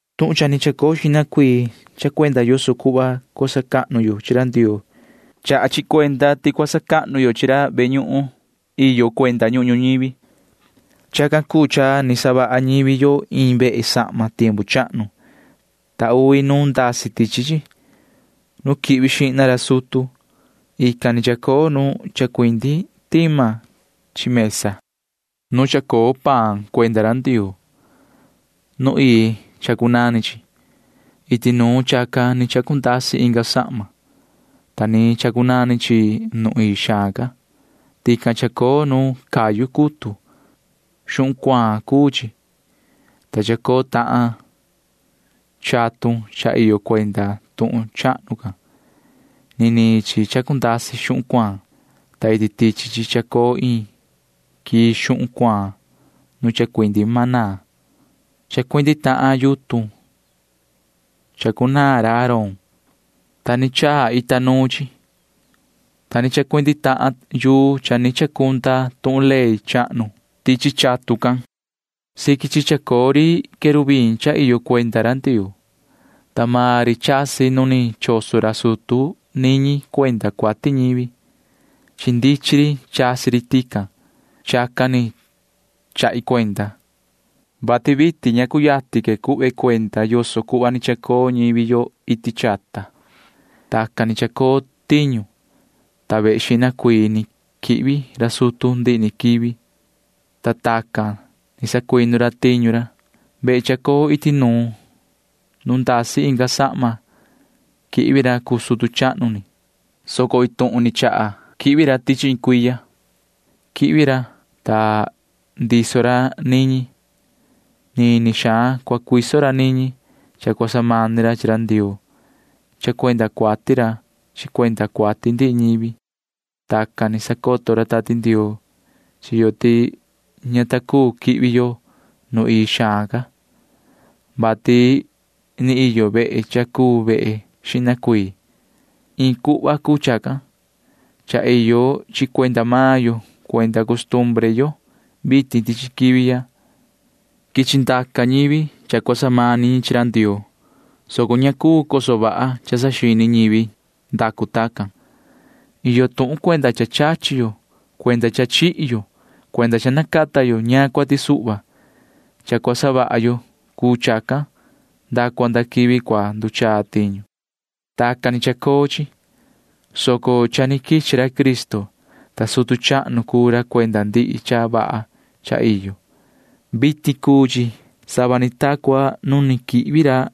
Tuhun cha ni chacoo xihna cuii chaha cuenda yoso cuhva cua sacahnu yo chi ra Ndioo. Chaha chi cuenda ti cua sacahnu yo chi ra ve ñuhun iyo cuenda ñuhun ñuñivi. Chacan cuu cha ni savaha ñivi yo iin vehe sahma tiempu chahnu, ta uvi nu ndasi tichi chi. Nu quihvi xihna ra sutu―ican ni chacoo nu chacuindi tima chi mesa nu chacoo paan cuenda ra Ndioo. Nu ii chacunani chi. Iti nuun chacan ni chacundasi inga sahma, ta ni chacunani chi nu ii xaan ca. Tican chacoo nu cayu cutu. Xuhun cuaan cuu chi, ta chacoo tahan chatun cha iyo cuenda tuhun chahnu can. Niniin chi chacundasi xuhun cuaan, ta iti tichi chi chacoo iin quii xuhun cuaan nu chacuindi maná. Chacuindi tahan yutun chacunaan ra Aarón, ta ni chaa ita nuu chi, ta chacuindi tahan yuu cha ni chacunda tuhun ley chahnu tichi chatun can. Siqui chi chacoo ri querubim cha iyo cuenda ra Ndioo, ta maan ri chasi nu ni choso ra sutu niñi cuenda cuati ñivi. Chi ndichin ri chasi ri tican. Chacan ni chahi cuenda, vati vitin ña cuyatin cuhva que cuenda yoso cuhva ni chacoo ñivi yo iti chata. Tacan ni chacoo tiñu, ta vehe xihna cuii ni quihvi ra sutu ndihi ni quivi, ta tacan ni sacuinu ra tiñu ra. Vehe chacoo iti nuun nu ndasi inga sahma quihvi ra cuu sutu chahnu ni, soco iin tuhun ni chaha ni quihvi ra tichi iin cuiya. Quihvi ra, ta ndiso ra niñi. Nini xaan cua cuiso ra niñi cha cua samani ra chi ra Ndioo cha cuenda cuati ra chi cuenda cuati ndihi ñivi. Tacan ni sacoto ra Tati Ndioo chi yo ti ña ta cuu quihvi yo nu ii xaan ca, vati ni iyo vehe cha cuu vehe xihna cuii. Iin cuhva cuu chacan. Cha iyo chi cuenda maan yo cuenda costumbre yo vitin tichi quivi ya. Quichi ndaca ñivi cha cua samani ñi chi ra Ndioo, soco ña cuu coso vaha cha saxini ñivi ndacu tacan. Iyo tuhun cuenda cha chachi yo cuenda cha chihi yo cuenda cha nacata yo ñaan cuati suhva. Cha cua savaha yo cuu chacan nda cua nda quivi cua nduchaa tiñu. Tacan ni chacoo chi, soco cha ni quichi ra Cristo, ta sutu chahnu cuu ra cuenda ndihi cha vaha cha iyo. Vitin cuu chi sava ni ta cua nu quihvi ra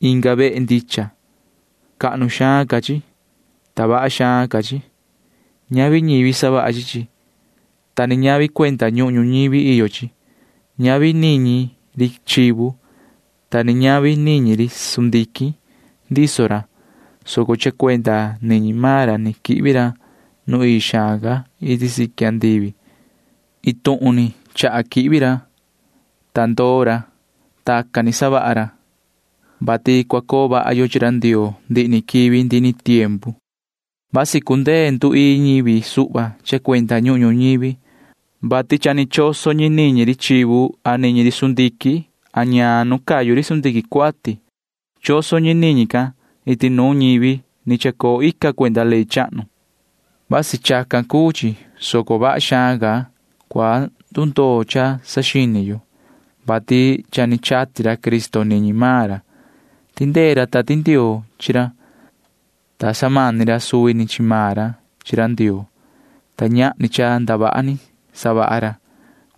inga vehe ndicha. Cahnu xaan ca chi, ta vaha xaan ca chi. Ñavi ñivi savaha chi chi, ta ni ñavi cuenda ñuhun ñuñivi iyo chi. Ñavi niñi ri chivu, ta ni ñavi niñi ri sundiquin ndiso ra, soco cha cuenda niñi maan ra ni quihvi ra nu ii xaan ca iti siqui andivi. Iin tuhun ni chaha quihvi ra, ta ndoo ra. Tacan ni savaha ra, vati cua coo vaha yo chi ra Ndioo ndihi ni quivi ndihi ni tiempu. Vasi cundee nduii ñivi suhva cha cuenda ñuhun ñuñivi, vati cha ni choso ñi niñi ri chivu a niñi ri sundiquin a ñaan nu cayu ri sundiquin cuati. Choso ñi niñi can iti nuun ñivi ni chacoo ica cuenda ley chahnu. Vasi chacan cuu chi, soco vaha xaan ca cua ndundoo cha saxini yo, vati cha ni chati ra Cristo niñi maan ra. Tindee ra Tati Ndioo chi ra, ta samani ra suvi ni chi maan ra chi ra Ndioo, ta ñahni cha ndavaha ni savaha ra.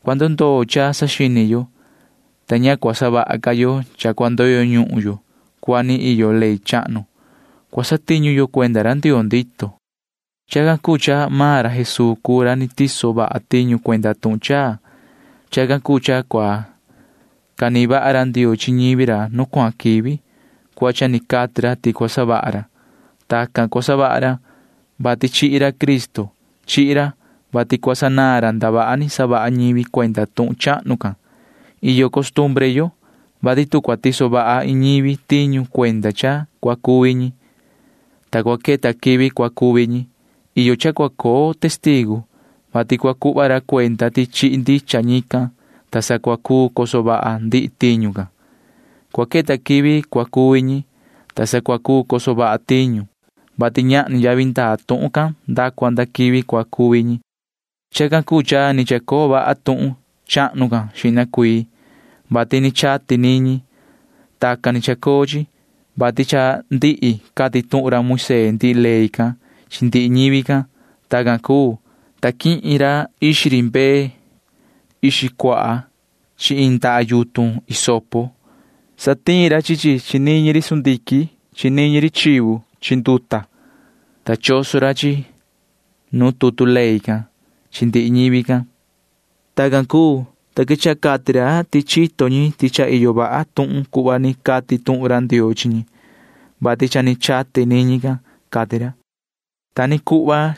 Cua ndundoo cha saxini yo, ta ña cua savaha ca yo cha cua ndoyo ñuhun yo cuhva ni iyo ley chahnu. Cua satiñu yo cuenda ra Ndioo ndito. Chacan cuu cha maan ra Jesuu cuu ra ni tiso vaha tiñu cuenda tuhun chaa. Chacan cuu cha cua canihin vaha ra Ndioo chi ñivi ra nu cuahan quivi cuhva cha ni cati ra ti cua savaha ra. Tacan cua savaha ra, vati chihi ra Cristo. Chihi ra, vati cua sanaan ra ndavaha ni savaha ñivi cuenda tuhun chahnu can. Iyo costumbre yo, vati tu cua tiso vaha iin ñivi tiñu cuenda cha cua cuvi ñi, ta cua queta quivi cua cuvi ñi, iyo cha cua coo testigu, vati cua cuhva ra cuenda ti chihi ndicha ñican, ta sa cua cuu coso vaha ndihi tiñu can. Cua queta quivi cua cuvi ñi, ta sa cua cuu coso vaha tiñu, vati ñahni yavi ndaa tuhun can nda cua nda quivi cua cuvi ñi. Chacan cuu cha ni chacoo vaha tuhun chahnu can xihna cuii, vati ni chati niñi. Tacan ni chacoo chi, vati cha ndihi cati tuhun ra Moisee ndihi ley can chi ndihi ñivi can. Tacan cuu, ta quihin ra ixi ri mbee ixi cuaha chi iin ndaha yutun hisopo. Satiin ra chi chi chi niñi ri sundiquin chi niñi ri chivu chi nduta, ta choso ra chi chi nuun tutu ley can chi ndihi ñivi can. Tacan cuu, ta quechaha cati ra ti chito ñi ti cha iyo vaha tuhun cuhva ni cati tuhun ra Ndioo chi ñi, vati cha ni chati niñi can, cati ra. Ta ni cuhva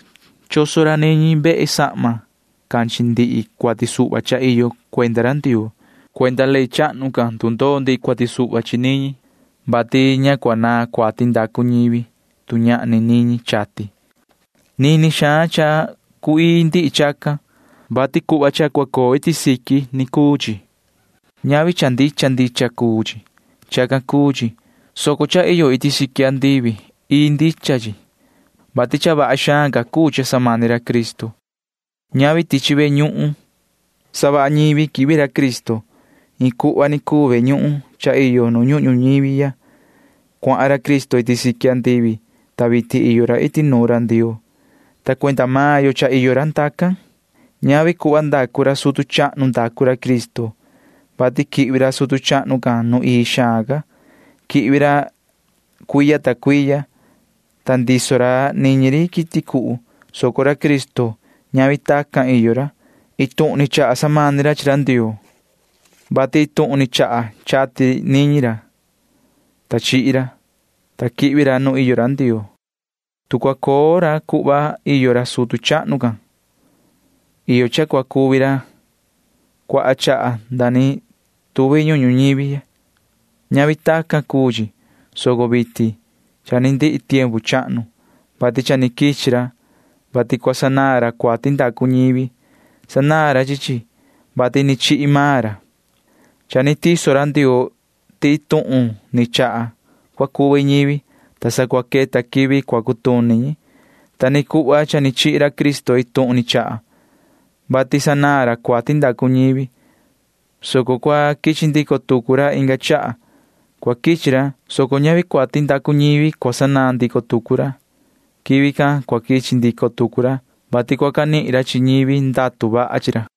choso ra niñi vehe sahma can chi ndihi cuati suhva cha iyo cuenda ra Ndioo. Cuenda ley chahnu can ndundoo ndihi cuati suhva chi niñi, vati ña cua naan cuati ndacu ñivi, tu ñahni niñi chati. Nini xaan cha cu‑ii ndihi chacan, vati cuhva cha cua coo iti siqui ni cuu chi. Ñavi cha ndicha ndicha cuu chi. Chacan cuu chi, soco cha iyo iti siqui andivi―ii ndicha chi, vati cha vaha xaan ca cuu cha samani ra Cristo. Ñavi tichi ve ñuhun savaha ñivi quihvi ra Cristo. Iin cuhva ni cuu ve ñuhun cha iyo nu ñuhun ñuñivi ya. Cuahan ra Cristo iti siqui andivi, ta vitin iyo ra iti nuun ra Ndioo, ta cuenda maan yo cha iyo ra ndacan. Ñavi cuhva ndacu ra sutu chahnu ndacu ra Cristo, vati quihvi ra sutu chahnu can nu ii xaan ca. Quihvi ra cuiya ta cuiya, ta ndiso ra niñi ri quiti cuhu, soco ra Cristo―ñavi tacan iyo ra. Iin tuhun ni chaha samani ra chi ra chi ra Ndioo, vati iin tuhun ni chaha chati niñi ra, ta chihi ra, ta quihvi ra nu iyo ra Ndioo. Tu cua coo ra cuhva iyo ra sutu chahnu can, iyo cha cua cuvi ra cuaha chaha nda ni tuvi ñuhun ñuñivi ya. Ñavi tacan cuu chi, soco vitin cha ni ndihi tiempu chahnu, vati cha ni quichi ra, vati cua sanaan ra cuati ndacu ñivi. Sanaan ra chi chi, vati ni chihi maan ra. Cha ni tiso ra Ndioo ti iin tuhun ni chaha cua cuvi ñivi, ta sa cua queta quivi cua cutuni ñi. Ta ni cuhva cha ni chihi ra Cristo iin tuhun ni chaha, vati sanaan ra cuati ndacu ñivi, soco cua quichi ndico tucu ra inga chaha. Cua quichi ra, soco ñavi cuati ndacu ñivi cua sanaan ndico tucu ra. Quivi can cua quichi ndico tucu ra, vati cua canihin ra chi ñivi ndatu vaha chi ra.